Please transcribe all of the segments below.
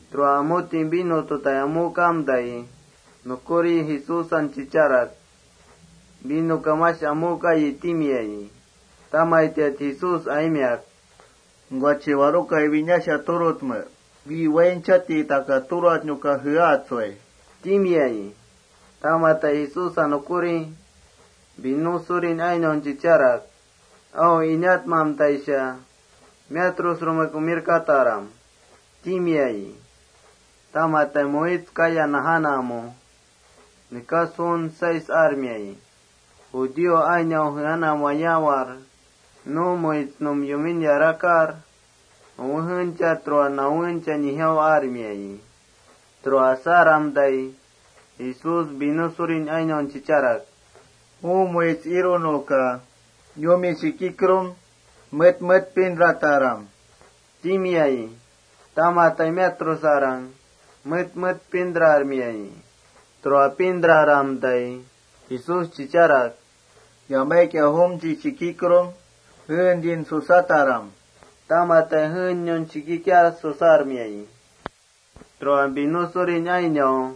Tura umuti vino tutai amukamtai, nukuri Jesúsan chicharak: —Vinoka mash amukayi, —timiayi. Tamaitiat Jesús aimiak: —Nukuachi ¿warukaya winasha turutme? Wi wainchatai takat turatnuka jeatsui, —timiayi. Tamati Jesúsa nukuri vino surin ainaun chicharak: —Au inatmamtaisha miatrusrumek umirkataram, —timiayi. Tamati muits kaya najanamu nekas juun seis armia nuna judío ainau jeanam wayaawar nu muitsnum yumin yarakar uwejencha, tura nawencha nijau armiayi. Tura asamtai, Jesús vino surin ainaun chicharak: —Ju muits irunuka yumi shikikrum, met met pintrataram, —timiayi. Tamati miatrusarang met met pintrarmiayi. Tura pintraramtai Jesús chicharak: —Yamaikia jumchik shikikrum jeentin susataram, —tamati shikikiar jeeniun susarmiayi. Tura vino surin ainau: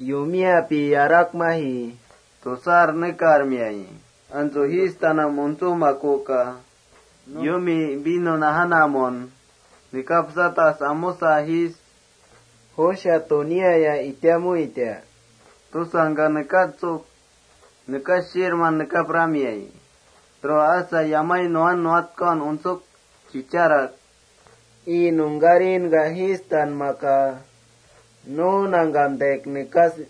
Yumiapi yarakmaji tusar nekarmiayi. Antsu fiestanam untsumakuka yumi vino najanamun nekapsatas umusa jiis: —¿Jusha tunia itamuita? —tusasha nekatsuk shiirman nekapramiayi. Tura asa yamai nuwan nuwatkaun untsuk chicharak: —Ii nungkarin fiesta najankurkia, nu nangkamtaik nekasar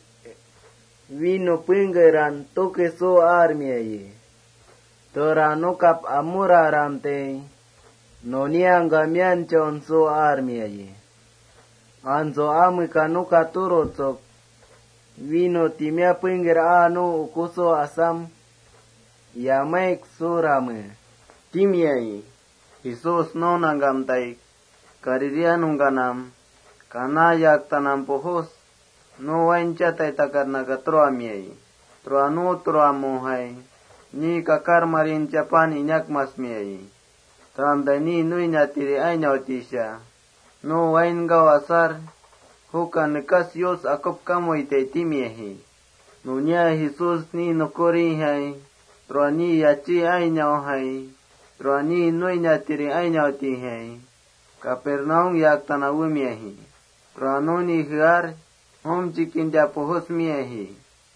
vino pengker tuke suaji. Tura nukap amuraramtai, nuniangka mianchaun suaji. Antsu ameka nuka turutsuk, vino pengker aa nu ukusu asam sukartame, —timiayi. Jesús nu nangkamtaik Galilea nungkanam Caná yaktanam nu wainchatai takatnaka turamiayi. Tura nu turamujai ni kakarmarin paan inakmasmiayi. Turamtai ni nuiniatiri ainautisha nu wainkau asar: “Juka nekas Yus akupkamuitai” timiaji. Nunia Jesús ni nukurijai, tura ni yachí ainaujai, tura ni nuiniatiri ainautijai Capernaum yaktanam wemiaji. Tura nuni jear, jumchik kinta pujusmiaji.+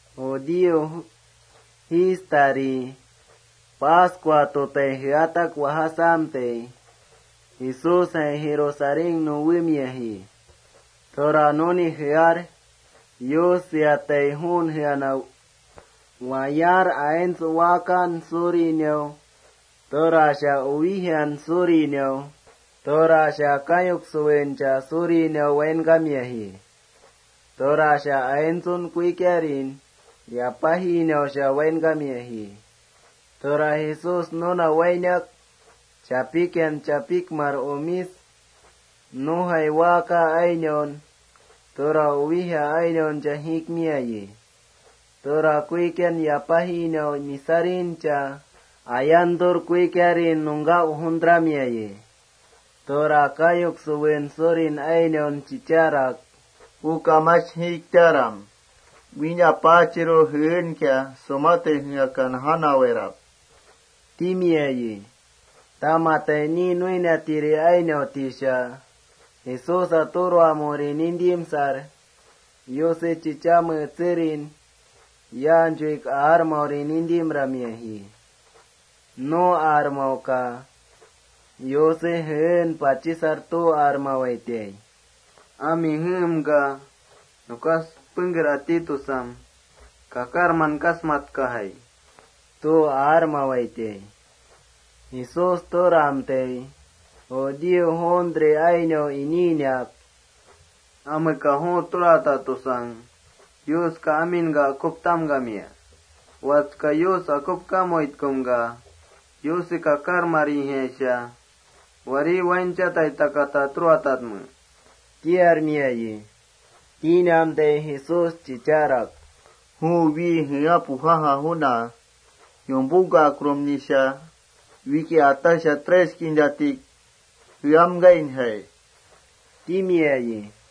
Judío fiestari, Pascua tutai jeatak wajasamtai, iikia Jesúsjai Jerusalénnum wemiaji.+ Tura nuni jear, Yus seatai juun jeanam wayaar, aints waakan surinau, tura uwijan surinau, tura kayuk suwencha surinau wainkamiaji. Tura aintsu kuikiarin yapajinausha wainkamiaji. Tura Jesús nuna wainak, chapikian chapikmar umis, nujai waaka ainaun, tura uwija ainauncha awatar jiikmiayi. Tura kuikia yapajinau misarincha ayantur, kuikiarin nungka ujuntramiayi. Tura kayuk suwen surin ainaun chicharak: —Juka mash jiiktaram. Wína Apaachiru jeenka surutai jeaka najanawairap, —timiayi. Tamati ni nuiniatiri ainautisha Jesúsa turamuri nintimsar, Yuse chichamen etserin yaanchuik aarmauri nintimramiaji. Nu aarmauka Yuse jeen pachisar tu aarmawaitai: “Ami jeemka nekas pengker asamtai, kakarman kasmatnuyajai,” tu aarmawaitai. Jesús turamtai, judío juuntri ainau iniinak: —¿Ameka ju turata tusang Yuska aminka akuptamkamia? Watska, Yus akupkamuitkumka, ¿Yuse kakarmarijai warí wainchati takata turatatme? —tiarmiayi. Tinamtai Jesús chicharak: —Wi ju jea pujaja juna yumpungkakrumnisha, wikia ataksha kampatmachik kintajai jeamkainjai, —timiayi.+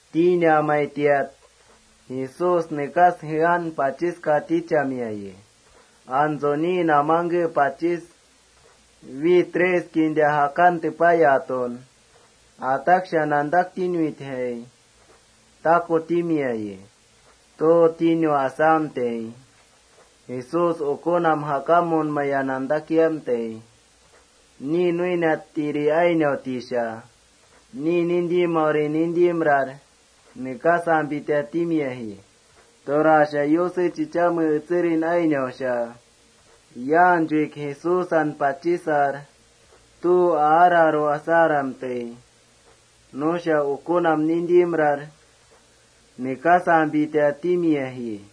Tinamaitiat Jesús nekas jean pachiska tichamiayi, antsu ni namangken pachis: Wi kampatam kinta jakan tepayatun ataksha nantaktinuitjai, taku timiayi. Tu tinu asamtai Jesús ukunam jakamunmaya nantakiamtai, ni nuiniatiri ainautisha ni timiauri nintimrar nekasampita timiaji. Tura Yuse chichamen etserin ainausha yaanchuik Jesúsan pachisar tu aararu asaramtai, nusha ukunam nimtimrar nekasampita timiaji.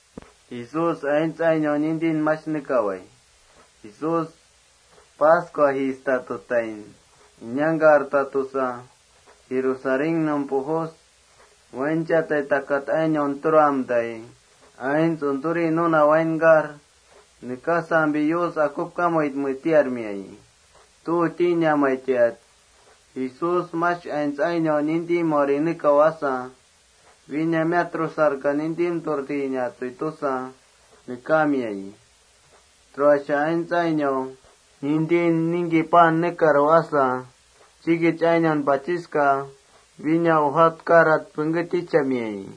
Nunia Jesús Pascua fiestan inangkartaj tusa, Jerusalénnum pujus, wainchati takat ainaun turamtai, aints untsuri nuna wainkar: Nekasmeapi Yus akupkamuitme tiarmiayi. Tinamaitiat Jesús mash aints ainau nintimaurin nekau asa, wína miatrusarka nintimturinatsui tusa nekaamiayi. Tura aints ainau nintin ningki paan nekaru asa, chikich ainaun pachiska wína ujatkarat pengké tichamiayi.+